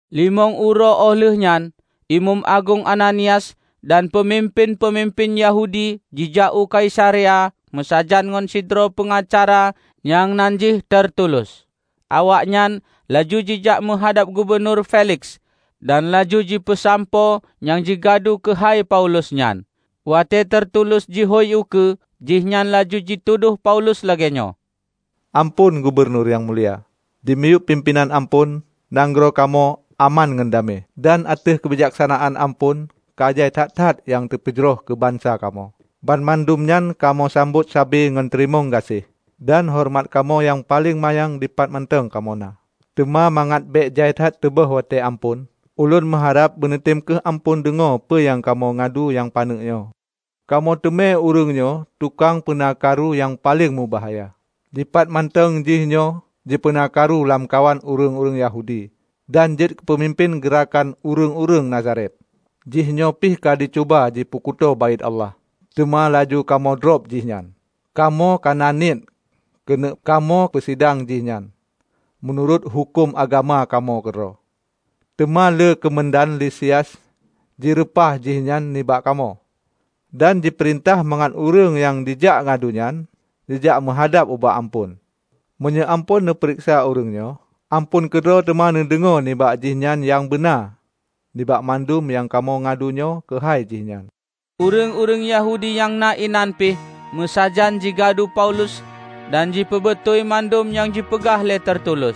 Limong uroe óh lheuehnyan, Imeum Agong Ananias dan peumimpén-peumimpén Yahudi jijak u Kaisarea meusajan ngon sidroe peungacara nyang nan jih Tertulus. Awaknyan laju jijak meuhadab Gubunur Feliks dan laju jipeusampoe nyang jigadu keuhai Paulus nyan. Watée Terutulus jihôi ukeue, jihnyan laju jitudôh Paulus lagée nyoe, "Amphon Gubunur Nyang Mulia! Dimiyueb pimpénan Amphon nanggroe kamoe aman ngon damé. Dan ateueh keubijaksanaan Amphon ka jai that-that nyang teupeujroh keu bansa kamoe. Banmandum nyan kamoe sambot sabe ngon teurimong gaséh dan horeumat kamoe nyang paleng manyang dipat mantong kamoe na. Teuma mangat bék jai that teubôh watée Amphon, ulôn meuharab beuneutem kheueh Amphon deungoe peue nyang kamoe gadu nyang paneuk nyoe. Kamoe teumé ureuëngnyoe tukang peuna karu nyang paleng mubahya. Dipatmantong jihnyoe jipeuna karu lamkawan ureuëng Yahudi dan jeuet keupeumimpén geurakan ureuëng-ureuëng Nazaret. Jihnyoe pih ka jicuba jipeukuto Baét Allah, teuma laju kamoe drob jihnyan. Kamoe kana niet keuneuk kamoe peusidang jihnyan meunurot huköm agama kamoe keudroe. Teuma lé keumandan Lisias jireupah jihnyan nibak kamoe, dan jipeurintah mangat ureuëng nyang jak gadu nyan jijak meuhadab ubak Amphon. Meunyoe Amphon neupareksa ureuëng nyoe, Amphon keudroe teuma neudeungoe nibak jihnyan nyang beuna nibak mandum nyang kamoe gadunyoe keuhai jih nyan." Ureuëng-ureuëng Yahudi nyang na inan pih meusajan jigadu Paulus dan jipeubeutôi mandum nyang jipeugah lé Tertulus.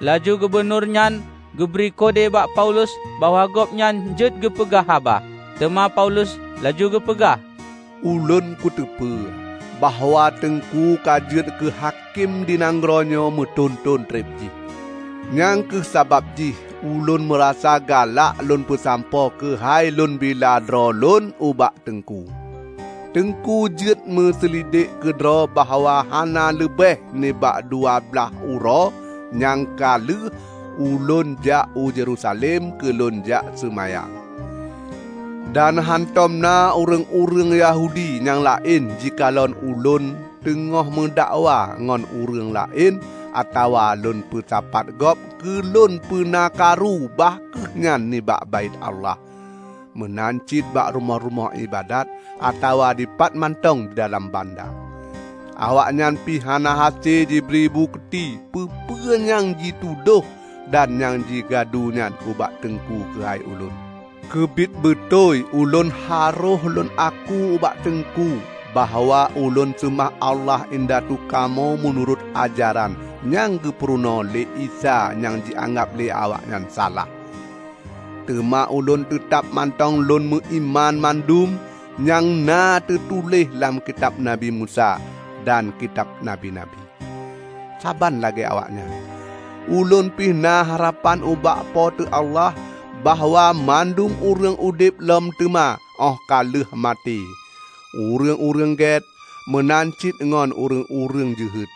Laju gubunurnyan geubri kode bak Paulus bahwa gobnyan jeuet geupeugah haba. Teuma Paulus laju geupeugah, "Ulôn kuteupeu bahwa Teungku ka jeuet keu hakém di nanggroenyoe meuthon-thon treb jih. Nyang kheueh sabab jih ulôn meurasa galak lôn peusampoe keuhai lôn bila droe lôn ubak Teungku. Teungku jeuet neuseulidek keudroe bahwa hana leubeh nibak dua blaih uroe nyang ka lheueh ulôn jak u Yerusalem keu lôn jak seumayang. Dan hántom na ureuëng-ureuëng Yahudi nyang laén jikalon ulôn teungoh meudakwa ngon ureuëng laén atawa lôn peusapat gob keu lôn peuna karu bah kheueh nyan nibak Baét Allah meunan cit bak rumoh-rumoh iébadat atawa dipatmantong didalam banda. Awaknyan pih hana hase jibri bukeuti peue-peue nyang jitudôh dan nyang jigadunyan ubak Teungku keuhai ulôn. Keubiet beutôi ulôn harôh lôn aku ubak Teungku bahwa ulôn seumah Allah indatu kamoe meunurot ajaran nyang geupeurunoe lé Isa nyang jianggab lé awaknyan salah. Teuma ulôn teutab mantong lôn meuiman mandum nyang na teutuléh lam Kitab Nabi Musa dan kitab Nabi-nabi. Saban lagée awaknyan, ulôn pih na harapan ubak Po teu Allah bahwa mandum ureuëng udeb lom teuma óh ka lheueh maté -- ureuëng-ureuëng gét, meunan cit ngon ureuëng-ureuëng jeuhet!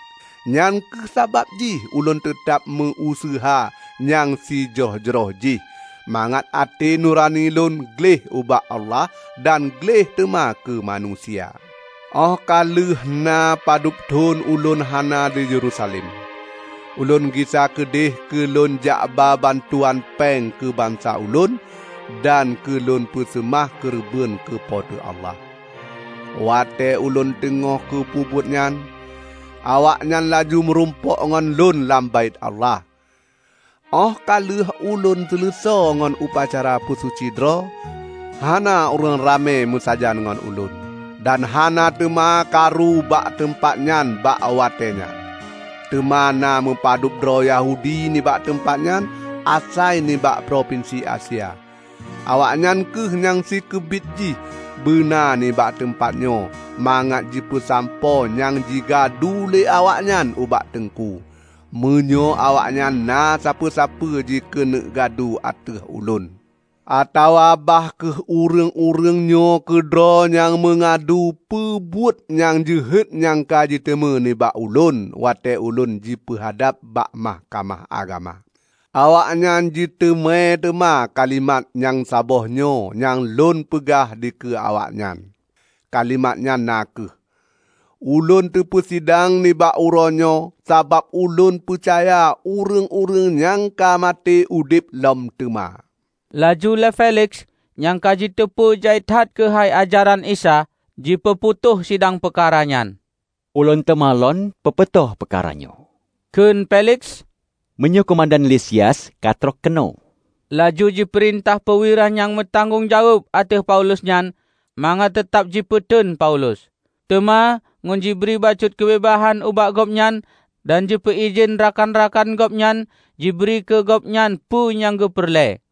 Nyang kheueh sabab jih ulôn teutab meu-useuha nyang si jroh-jroh jih, mangat até nurani lôn gleh ubak Allah dan gleh teuma keu manusia. Óh ka lheueh na padub thon ulôn hana di Yerusalem, ulôn gisa keudeuh keu lôn jakba bantuan péng keu bansa ulôn dan keu lôn peuseumah keureubeuen keu Po teu Allah. Watée ulôn teungoh kupeubuet nyan, awaknyan laju meurumpok ngon lôn lam Baét Allah, óh ka lheueh ulôn seuleusoe ngon upacara peusuci droe. Hana ureuëng ramé meusajan ngon ulôn, dan hana teuma karu bak teumpat nyan bak watée nyan. Teuma na meupadubdroe Yahudi nibak teumpat nyan asai nibak propinsi Asia. Awaknyan kheueh nyang sikeubiet jih beuna nibak teumpat nyoe mangat jipeusampoe nyang jigadu lé awaknyan ubak Teungku, meunyoe awaknyan na sapeue-sapeue jikeuneuk gadu ateueh ulôn. Atawa bah kheueh ureuëng-ureuëng nyoe keudroe nyang meungadu peu buet nyang jeuhet nyang ka jiteumé nibak ulôn watée ulôn jipeuhadab bak Mahkamah Agama. Awaknyan jiteumé teuma kalimat nyang saboh nyoe nyang ulôn peugah dikeue awaknyan, kalimat nyan na kheueh: Ulôn teupeusidang nibak uroenyoe sabab ulôn peucaya ureuëng-ureuëng nyang ka maté udeb lom teuma." Laju lé Feliks nyang ka jiteupeu jai that keuhai ajaran Isa, jipeuputôh sidang peukara nyan, "Ulôn teuma lôn peuputôh peukaranyoe," kheun Feliks, "meunyoe keumandan Lisias ka trok keunoe." Laju jipeurintah peuwira nyang meutanggong jaweueb ateueh Paulus nyan mangat teutab jipeuteun Paulus, teuma ngon jibri bacut keubeubaihan ubak gobnyan dan jipeuidhin rakan-rakan gobnyan jibri keugobnyan peue nyang geupeureulée.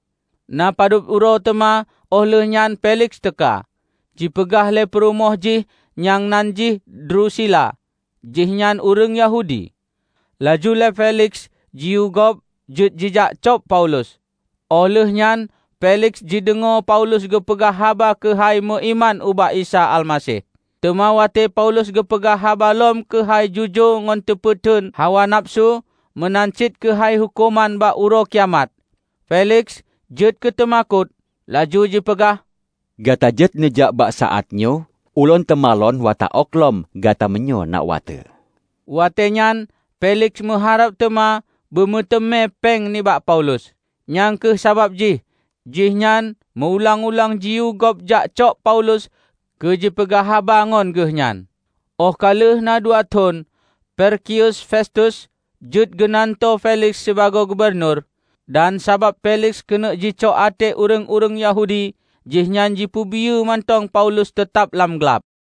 Na padub uroe teuma óh lheueh nyan Feliks teuka, jipeungah lé peurumoh jih nyang nan jih Drusila; jihnyan ureuëng Yahudi. Laju lé Feliks jiyue gob jeuet jijakcok Paulus, óh lheuehnyan Feliks jideungoe Paulus geupeugah haba keuhai meuiman ubak Isa Almaseh. Teuma watée Paulus geupeugah haba lom keuhai jujoe ngon teupeuteuen hawa nafeusu meunan cit keuhai huköman bak Uroe Kiamat, Feliks jeuet keuteumakot laju jipeugah, "Gata jeuet neujak bak saátnyoe ulôn teuma lôn tawök lom gata meunyoe na watée." Watée nyan Feliks meuharab teuma beumeuteumé péng nibak Paulus. Nyang kheueh sabab jih jihnyan meu-ulang-ulang jiyue gob jakcok Paulus keu jipeugah haba ngon geuhnyan. Óh ka lheueh na dua thon, Perkius Festus jeuet geunantoe Feliks sibagoe gubunur. Dan sabab Feliks keuneuk jicok até ureuëng-ureuëng Yahudi, jihnyan jipeubiyeu mantong Paulus teutab lam glab.